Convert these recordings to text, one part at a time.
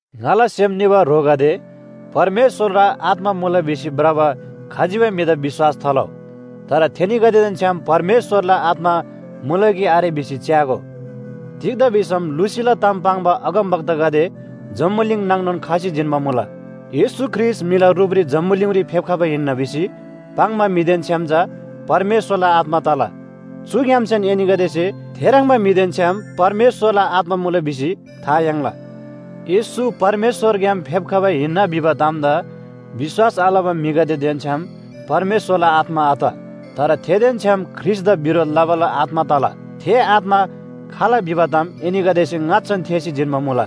ङाला सेम निबा ह्रोगदे, परमेश्‍वरला आत्‍मा मुला भिसी भ्रबा खजिबै म्‍हिदा विश्‍वास थालउ। तर थेनीगदेदेन छ्‌याम परमेश्‍वरला आत्‍मा मुला कि आरे भिसी च्‍यागो। तिग्‍दा भिसम लुसीला ताम पाङ्बा अगमवक्तागदे जम्‍बुलिङ नाङनोन खसी जिन्‍बा मुला। येशू ख्रीष्‍ट म्‍हिला रुपरी जम्‍बुलिङरी फेप्‍खबा हिन्‍ना भिसी पाङ्बा म्‍हिदेन छ्‌याम चा परमेश्‍वरला आत्‍मा तला। चुग्‍यामसेन एनीगदेसे थेह्रङ्बा म्‍हिदेन छ्‌याम परमेश्‍वरला आत्‍मा मुला भिसी था याङ्ला। येशू परमेश्‍वरग्‍याम फेप्‍खबा हिन्‍ना भिबा तामदा विश्‍वास आलबा म्‍हिगदेदेन छ्‌याम परमेश्‍वरला आत्‍मा आत। तर थेदेन छ्‌याम ख्रीष्‍टदा बिरोध लबाला आत्‍मा तला। थे आत्‍मा खाल भिबा ताम एनीगदेसे ङाच्‍छान थेःसी जिन्‍बा मुला।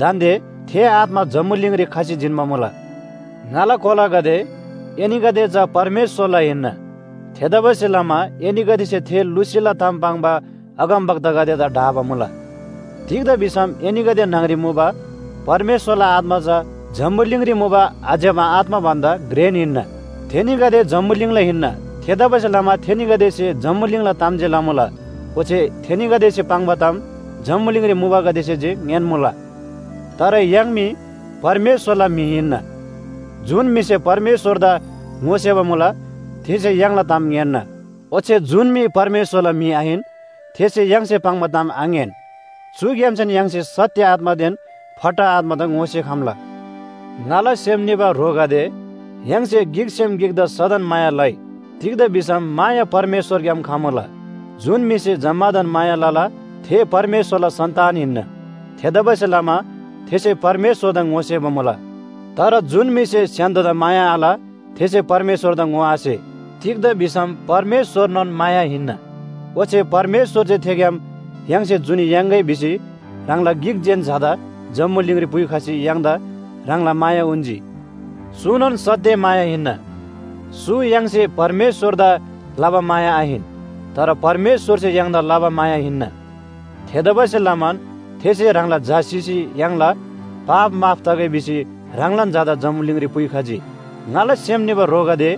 दान्‍दे थे आत्‍मा जम्‍बुलिङरी खसी जिन्‍बा मुला। ङाला कोलागदे, एनीगदे चा परमेश्‍वरला हिन्‍ना। थेतबासेलमा एनीगदेसे थे लुसीला ताम पाङ्बा अगमवक्तागदेदा ढाबा मुला। तिग्‍दा भिसम एनीगदे न्‍हङरी मुबा परमेश्‍वरला आत्‍मा चा जम्‍बुलिङरी मुबा आज्‍यबा आत्‍मा भन्‍दा घ्रेन हिन्‍ना। थेनीगदे जम्‍बुलिङला हिन्‍ना। थेतबासेलमा थेनीगदेसे जम्‍बुलिङला ताम जे लमुला। ओच्‍छे थेनीगदेसे पाङ्बा ताम जम्‍बुलिङरी मुबागदेसे जे ङ्‌यान्‍मुला। तर य्‍हाङ मी परमेश्‍वरला म्‍हि हिन्‍ना। जुन म्‍हिसे परमेश्‍वरदा ङोसेबा मुला थेसे य्‍हाङला ताम ङ्‌यान्‍ना। ओच्‍छे जुन म्‍हि परमेश्‍वरला म्‍हि आहिन, थेसे य्‍हाङसे पाङ्बा ताम आङ्‌यान। चुग्‍यामसेन य्‍हाङसे सत्‍य आत्‍मादेन फट्टा आत्‍मादा ङोसेखम्‍ला। ङाला सेम निबा ह्रोगदे, य्‍हाङसे गिकसेम गिकदा सदन माया लइ। तिग्‍दा भिसम माया परमेश्‍वरग्‍याम खमुला। जुन म्‍हिसे जम्‍मादान माया लला, थे परमेश्‍वरला सन्‍तान हिन्‍ना। थेतबासेलमा थेसे परमेश्‍वरदा ङोसेबा मुला। तर जुन म्‍हिसे स्‍य्‍हान्‍दोदा माया आल, थेसे परमेश्‍वरदा ङोआसे। तिग्‍दा भिसम परमेश्‍वरनोन माया हिन्‍ना। ओच्‍छे परमेश्‍वरसे थेग्‍याम य्‍हाङसे जुनी याङ्‌गै भिसी ह्राङला गिक जेन झादा जम्‍बुलिङरी पुइखसी य्‍हाङदा ह्राङला माया उन्‍जी। चुनोन सत्‍य माया हिन्‍ना। चु य्‍हाङसे परमेश्‍वरदा लबा माया आहिन, तर परमेश्‍वरसे य्‍हाङदा लबा माया हिन्‍ना। थेतबासेलमान थेसे ह्राङला झा सिसी य्‍हाङला पाप माफ तगै भिसी ह्राङलान झादा जम्‍बुलिङरी पुइखजी। ङाला सेम निबा ह्रोगदे,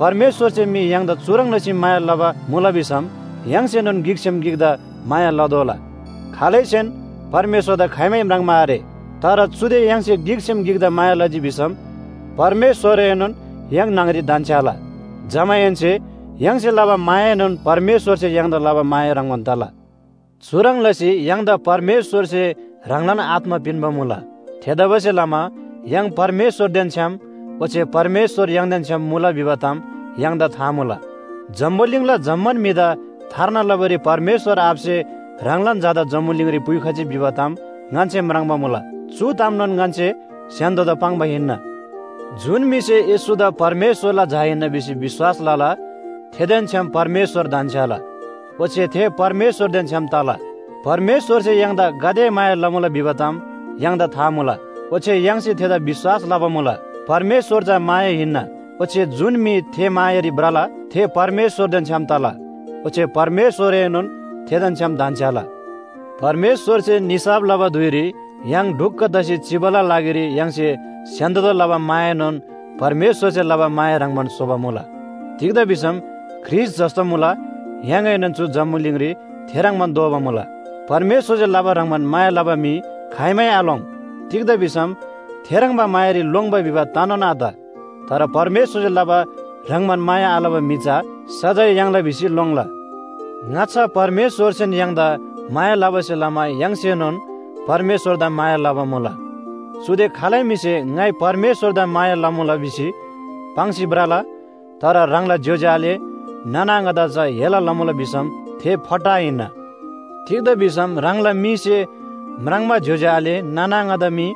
परमेश्‍वरसे मी य्‍हाङदा चुह्रङ् लसी माया लबा मुला भिसम य्‍हाङसेनोन गिकसेम गिकदा माया लतोःला। खालैसेन परमेश्‍वरदा खाइमै म्राङ्बा आरे। तर चुदे य्‍हाङसे गिकसेम गिकदा माया लजी भिसम परमेश्‍वरएनोन य्‍हाङ न्‍हङरी धन्‍छ्‌याला। जमाहेन्‍से य्‍हाङसे लबा मायाएनोन परमेश्‍वरसे य्‍हाङदा लबा माया ह्रङ्‌बान तला। चुह्रङ् लसी य्‍हाङदा परमेश्‍वरसे ह्राङलान आत्‍मा पिन्‍बा मुला। थेतबासेलमा य्‍हाङ परमेश्‍वरदेन छ्‌याम, ओच्‍छे परमेश्‍वर य्‍हाङदेन छ्‌याम मुला भिबा ताम य्‍हाङदा था मुला। जम्‍बुलिङला जम्‍मान म्‍हिदा थार्ना लबारी परमेश्‍वर आबासे ह्राङलान झादा जम्‍बुलिङरी पुइखजी भिबा ताम ङन्‍से म्राङ्बा मुला। चु तामनोन ङन्‍से स्‍य्‍हान्‍दोदा पाङ्बा हिन्‍ना। जुन म्‍हिसे येशूदा परमेश्‍वरला झा हिन्‍ना भिसी विश्‍वास लला, थेदेन छ्‌याम परमेश्‍वर धन्‍छ्‌याला, ओच्‍छे थे परमेश्‍वरदेन छ्‌याम तला। परमेश्‍वरसे य्‍हाङदा गाते माया लमुला भिबा ताम य्‍हाङदा था मुला, ओच्‍छे य्‍हाङसे थेदा विश्‍वास लबा मुला। परमेश्‍वर चा माया हिन्‍ना, ओच्‍छे जुन म्‍हि थे मायारी भ्रला, थे परमेश्‍वरदेन छ्‌याम तला, ओच्‍छे परमेश्‍वरएनोन थेदेन छ्‌याम धन्‍छ्‌याला। परमेश्‍वरसे निसाफ लबा धुइरी य्‍हाङ ढुक्‍क तसी चिबाला लागिरी य्‍हाङसे स्‍य्‍हान्‍दोदा लबा मायाएनोन परमेश्‍वरसे लबा माया ह्रङ्‌बान स्‍होबा मुला। तिग्‍दा भिसम ख्रीष्‍ट जस्‍तो मुला य्‍हाङएनोन चु जम्‍बुलिङरी थे ह्रङ्‌बान दोबा मुला। परमेश्‍वरसे लबा ह्रङ्‌बान माया लबा म्‍हि खाइमै आलोङ्। तिग्‍दा भिसम थेह्रङ्बा मायारी लोङ्‌बा भिबा तनोन आत। तर परमेश्‍वरसे लबा ह्रङ्‌बान माया आलबा म्‍हि चा सजाय याङ्ला भिसी लोङ्ला। ङाच्‍छा परमेश्‍वरसेन य्‍हाङदा माया लबासे लमा य्‍हाङसेनोन परमेश्‍वरदा माया लबा मुला। चुदे खालै म्‍हिसे “ङाइ परमेश्‍वरदा माया लमुला” भिसी पाङ्सी भ्रला, तर ह्राङला ज्‍योज्‍यो आले नाना आङादा चा हेला लमुला भिसम थे फट्टा हिन्‍ना। तिग्‍दा भिसम ह्राङला मीसे म्राङ्बा ज्‍योज्‍यो आले नाना आङादा मी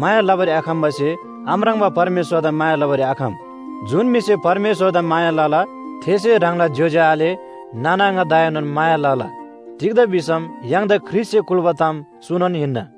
माया लबारी आखम्‍बासे आम्राङ्बा परमेश्‍वरदा माया लबारी आखम। जुन म्‍हिसे परमेश्‍वरदा माया लला, थेसे ह्राङला ज्‍योज्‍यो आले नाना आङादाएनोन माया लला। तिग्‍दा भिसम य्‍हाङदा ख्रीष्‍टसे कुल्‍बा ताम चुनोन हिन्‍ना।